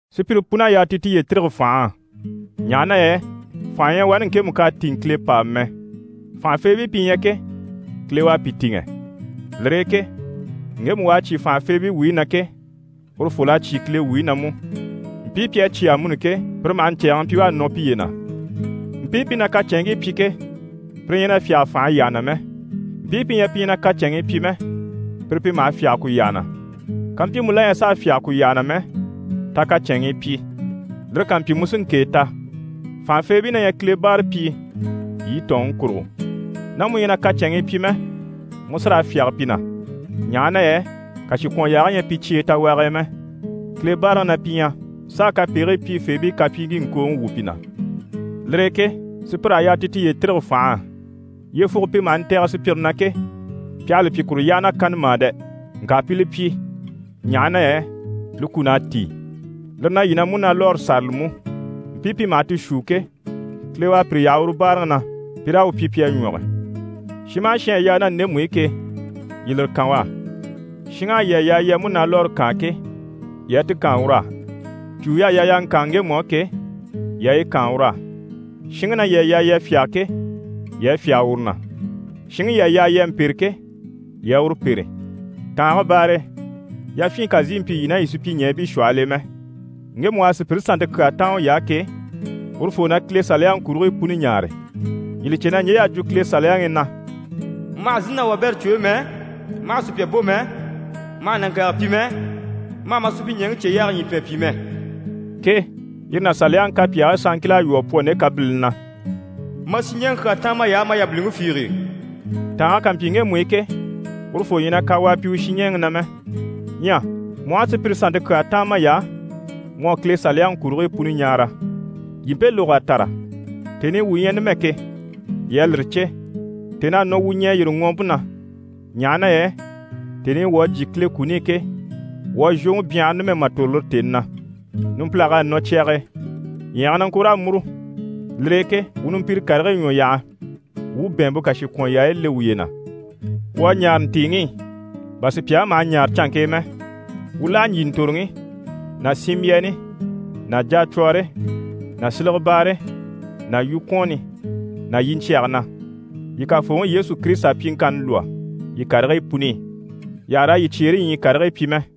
Sùpyire pun'à yaa ti tiye tîrige fành'á, ɲaha na yɛ fànha ɲyɛ wani, ŋkemu k'à tìŋɛ Kile pàama mɛ, fànhafeebii pi ɲyɛ ke, Kile u à pi tìŋɛ. Lire e ke ŋgemu u à cyé fànhafeebii wuyi na ke, urufol'à cyé Kile wuyi na mú. Mpii pi à cyé amuni ke, pire maha ɲcɛ̀ɛgɛŋi pyi u à nɔ piye na. Mpii pi na kacɛnŋkii pyi ke, pire ɲyɛ na fyáge fànhe yyaha na mɛ, mpii pi ɲyɛ pi ɲyɛ na kacɛnŋii pyi mɛ, pire pi maha fyáge ku yyaha na. Kampyi mu la ɲyɛ s'a fyáge ku yyaha na mɛ, ta kacɛnŋii pyi. Lire ká mpyi, mu sí ŋkèe ta. Fànhafeebii na ɲyɛ Kile báarapyii yii tɔ̀ɔnŋi kurugo. Ná mu ɲyɛ na kacɛnŋii pyi mɛ, mu sí raa fyáge pi na, ɲaha na yɛ kàshikwɔnyaage ɲyɛ pi cye e tawage e mɛ. Kile báaraŋi na pi ɲyɛ s'a kapegigii pyifeebii kapyiiŋkii ŋkooŋi wwû pi na. Lire e ke sùpyir'à yaa ti tiye tîrige fành'á. Yyefuge pi maha ntɛ̀gɛ sùpyire na ke, pi àha li pyi kuru yyaha na kanna mà dɛ, ŋka pi li pyi, ɲaha na yɛ li kun'à tíi. Lire na yii na múnalwɔɔre sârali mú. Mpii pi maha ti shuu ke, Kile u à pire yaha uru báaraŋi na, pi raa u pyi pi a ɲwɔge. Shin maha shin à yaa ná ndemu i ke, yii lire kan u á. Shinŋ'á yii à yaa yii a múnalwɔɔre kaan ke, yii a ti kaan ur'á. Cùuy'à yaa y'a ŋkaan ŋgemu á ke, yii a yi kaan ur'á. Shinŋi na yii à yaa yii a fyáge ke, yii a fyáge uru na. Shinŋi yii à yaa yii a mpêre ke, yii a uru pêre. Tàange baare e, yafyin kà zìi mpyi yii ná yii supyiɲɛɛbii shwɔhɔl'e mɛ. Ŋgemu u à sùpyire sannte kyaa táan uy'á ke, urufoo na Kile Saliyaŋi kurigii puni ɲáare. Yii li cè na ɲje y'à jwo Kile Saliyaŋi i na: «Ma hà zínni ná wabɛrɛ cwo e mɛ, ma hà sùpya bò mɛ, ma hà nàŋkaaga pyi mɛ, ma hà ma supyiɲɛɛŋi cyeyaage ɲyipɛɛn pyi mɛ» ke, yire ná Saliyaŋi kapyaagii sanŋkil'à lwɔ́ a pwɔ nde kabilini na: «Ma shinɲɛɛŋi kyaa táan may'á ma yabiliŋi fiige.» Tàange ká mpyi ŋgemu i ke, urufoo ɲyɛ na kawaa pyi u shinɲɛɛŋi na mɛ. Ɲyɛ mu aha sùpyire sannte kyaa táan may'á, mu à Kile Saliyaŋi kurigii puni ɲaara. Yii mpe lóg'a tara, tèni i wuu ɲyɛ numɛ ke, yii à lire cè. Tèn'à nɔ wuu ɲɛ̀ a yîri ŋɔɔmpe na, ɲaha na yɛ tèni i wuu à jyè Kile kuni i ke, wuu à zhwoŋi byanhara numɛ mà tòro lire tèni na. Numpilag'à nɔ cyage e, ɲyɛge na ŋko raa múru. Lire e ke wuu numpire karigii ɲwɔ yaha, wuu bɛ̀ɛnmpe kàshikwɔnyaayi le wuye na. Wuu a ɲaare ntìiŋi i, bà sùpyaŋi maha ɲaare canŋke e mɛ. Wuu láha ɲjyìntoroŋi ná sinmbyaani ná jacwɔɔre ná silegebaare ná yukwɔɔnni ná yiɲcyɛge na. Yii Kafooŋi Yesu Kirisita pyiŋkanni lwɔ́ yii karigii puni i, yii àha raa yii cyeere ɲyii karigii pyi mɛ.